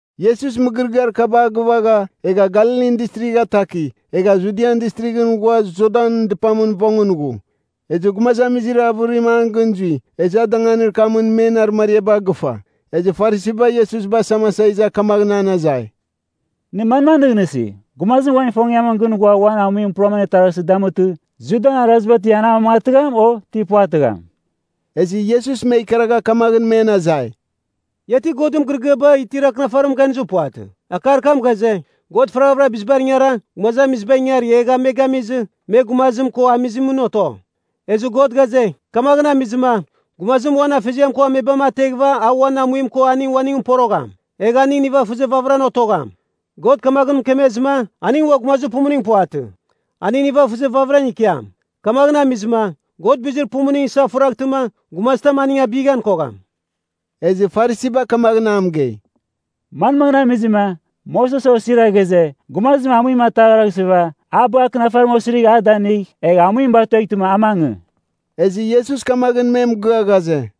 Iesus mɨgɨrɨgɨar kaba a gɨvagha, egha Galilin Distrigh ataki, egha Judian Distrighɨn ghua Jordan dɨpamɨn vongɨn ghu. Ezɨ gumazamizir avɨrim an gɨn zui, ezɨ a danganir kamɨn men arɨmariaba agɨfa. Ezɨ Farisiba Iesus basamasa iza kamaghɨn an azai, “Nɨ manmaghɨn nɨghnɨsi? Gumazim uan ifongiamɨn gɨn ghua uan amuim puram anetaghraghɨsɨ damutɨ, Judan Araziba ti an amamangatɨgham, o ti puvatɨgham?” Ezɨ Iesus me ikaragha kamaghɨn men azai, “Ia ti Godɨn mɨgɨrɨgɨaba itir Akɨnafarimɨn ganizir puvatɨ? Akar kam ghaze, ‘God faraghavɨra bizibar ingara, gumazamizibar ingari egha me gamizɨ, me gumazim ko amizimɨn oto.’ Ezɨ God ghaze, ‘Kamaghɨn amizɨma, gumazim uan afeziam ko amebam ateghɨva a uan amuim ko aning uaningɨn porogham. Egh aning nivafɨzir vamɨram otogham.’ God kamaghɨn mɨkemezɨma, aning ua gumazir pumuning puvatɨ. Aning nivafɨzir vamɨra ikiam. Kamaghɨn amizɨma, God bizir pumuning isafuraghtɨma, gumazitam aning abighan kogham.” Ezɨ Farisiba kamaghɨn a mɨgei, “Manmaghɨn amizɨma, Moses osira ghaze, gumazim amuim ataghraghsɨva, a bagh akɨnafarim osirigh a danɨngigh, egh amuim batueghtɨma a mangɨ?” Ezɨ Iesus kamaghɨn me mɨgɨa ghaze,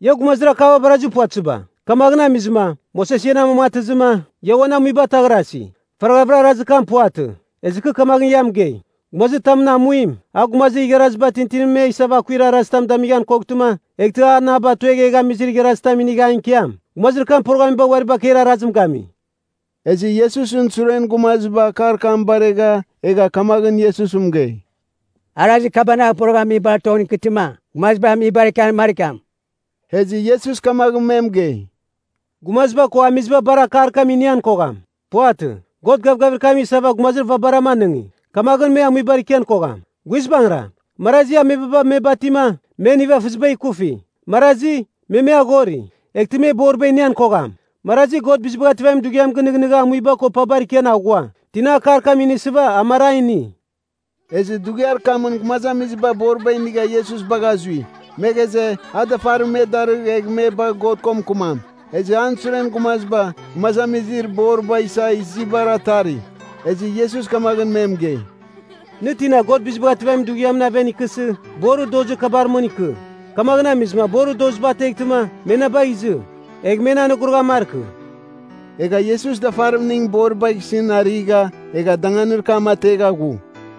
“Ia gumazir akaba barazir puvatɨziba. Kamaghɨn amizɨma, Moses ian amamangatɨzɨma, ia uan amuiba ataghrasi. Faraghavɨra arazir kam puvatɨ. Ezɨ kɨ kamaghɨn ia mɨgei, gumazitamɨn amuim, a gumazir igharaziba tintinibar me isava akuir arazitam damighan koghtɨma, eghtɨ an a batuegh egh amizir igharazitam inigh an ikiam, gumazir kam poroghamiba uari bakeir arazim gami.” Ezɨ Iesusɨn suren gumaziba akar kam baregha egha kamaghɨn Iesus mɨgei, “Arazir kabanagh poroghamibar tongɨn ikɨtɨma, gumaziba amibar ikian markiam.” Ezɨ Iesus kamaghɨn me mɨgei, “Gumaziba ko amiziba bar akar kam inian kogham. Puvatɨ, God gavgavir kam isava gumazir vabaram anɨngi. Kamaghɨn me amuibar ikian kogham. Guizbangɨra, marazi amebaba me batima, men nivafɨziba ikufi. Marazi, me me aghori, eghtɨ me boriba inian kogham. Marazi God Bizibagh Ativamin Dughiam gɨnɨghnɨgha amuiba ko pabar ikian aghua. Tina akar kam inisɨva a mar a ini.” Ezɨ dughiar kamɨn gumazamiziba boriba inigha Iesus bagha zui. Me ghaze, a dafarim me darɨgh egh me bagh God ko mɨkɨmam. Ezɨ an suren gumaziba, gumazamizir boriba isa izibar atari. Ezɨ Iesus kamaghɨn me mɨgei, “Nɨ tina God Bizibagh Ativamin Dughiamɨn aven ikɨsɨ, borir dozir kabar mɨn ikɨ. Kamaghɨn amizɨma borir doziba ateghtɨma, me na bagh izɨ, egh men anogoroghan markɨ.” Egha Iesus dafarimning boribagh isɨn arigha, egha danganir kam ategha ghu.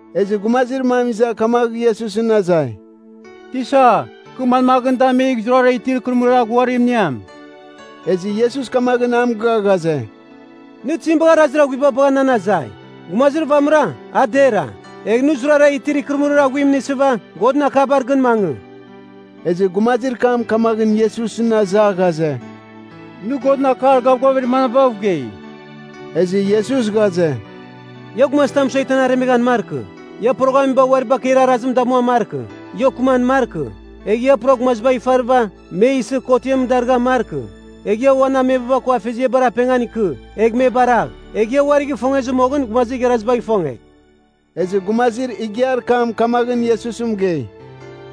Ezɨ gumazir mam iza kamagh Iesusɨn azai, “Tisa, kɨ manmaghɨn damigh zurara itir ikɨrɨmɨrir aghuarim iniam?” Ezɨ Iesus kamaghɨn a mɨgɨa ghaze, “Nɨ tizim bagha arazir aghuiba bagha nan azai? Gumazir vamɨra, a dera. Egh nɨ zurara itir ikɨrɨmɨrir aghuim inisɨva, Godɨn akabar gɨn mangɨ” Ezɨ gumazir kam kamaghɨn Iesusɨn aza ghaze, “Nɨ Godɨn akar gavgavir manabav gei?” Ezɨ Iesus ghaze, “Ia gumazitam mɨsueghtɨ an aremeghan markɨ, ia poroghamiba uari bakeir arazim damuan markɨ, ia okɨman markɨ, egh ia pura gumazibagh ifarɨva, me isɨ kotiam darɨghan markɨ, egh ia uan amebaba ko afeziabar apengan ikɨ egh me baragh, egh ia uari gɨfongezɨ moghɨn gumazir igharazibagh ifonge.” Ezɨ gumazir igiar kam kamaghɨn Iesus mɨgei,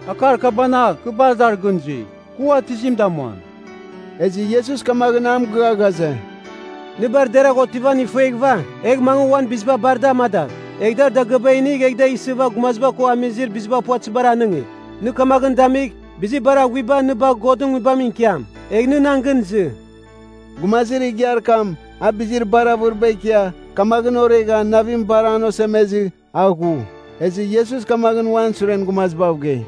“Akar kabanagh, kɨ bar dar gɨn zui. Kɨ ua tizim damuam?” Ezɨ Iesus kamaghɨn a mɨgɨa ghaze, “Nɨ bar deragh otivan ifueghɨva, egh mangɨ uan biziba bar da amadagh. Egh dar dagɨaba inigh egh da isɨva gumaziba ko amizir biziba puvatɨzibar anɨngigh. Nɨ kamaghɨn damigh, bizir bar aghuiba nɨ bagh Godɨn Nguibamɨn ikiam. Egh nɨ nan gɨn izɨ.” Gumazir igiar kam, a bizir bar avɨriba ikia, kamaghɨn oregha navim bar an osemezɨ, a ghu. Ezɨ Iesus kamaghɨn uan suren gumazibav gei,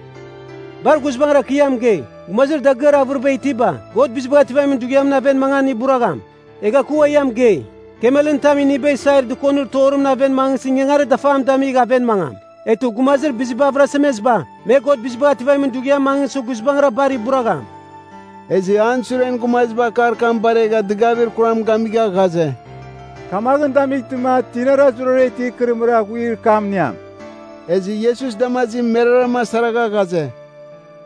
“Bar guizbangɨra kɨ ia mɨgei, gumazir dagɨar avɨriba itiba, God Bizibagh Ativamin Dughiamɨn aven mangan iburagham. Egha kɨ ua ia mɨgei, kamelɨn tam iniba isair dɨkonir torimɨn aven mangɨsɨ ingangarir dafam damigh aven mangam. Eghtɨ gumazir biziba avɨrasemeziba, me God Bizibagh Ativamin Dughiamɨn mangɨsɨ guizbangɨra bar iburagham!” Ezɨ an suren gumaziba akar kam baregha dɨgavir kuram gamigha ghaze, “Kamaghɨn damightɨma, tinara zurara itir ikɨrɨmɨrir aghuir kam iniam?” Ezɨ Iesus damazim meraram asaragha ghaze,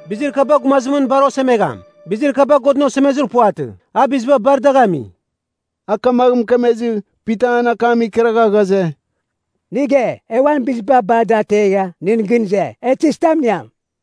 “Bizir kaba gumazimɨn bar osemegham. Bizir kaba Godɨn osemezir puvatɨ. A biziba bar dagh ami.” A kamagh mɨkemezɨ, Pita an akam ikaragha ghaze, “Nɨ ge, e uan biziba bar da ategha, nɨn gɨn ize. E tizitam iniam?”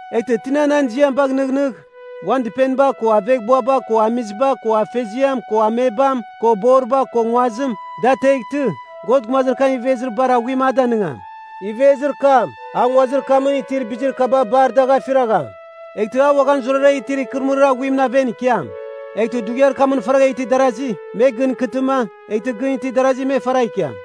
Eghtɨ tina nan ziam bagh nɨghnɨgh, uan dɨpeniba ko aveghbuaba ko amiziba ko afeziam ko amebam ko boriba ko nguazim, da ateghtɨ, God gumazir kam ivezir bar aghuim a danɨngam. Ivezir kam, a nguazir kamɨn itir bizir kaba bar dagh afiragham. Eghtɨ a uaghan zurara itir ikɨrɨmɨrir aghuimɨn aven ikiam. Eghtɨ dughiar kamɨn faragha itir darazi, me gɨn ikɨtɨma, eghtɨ gɨn itir darazi me faragh ikiam.”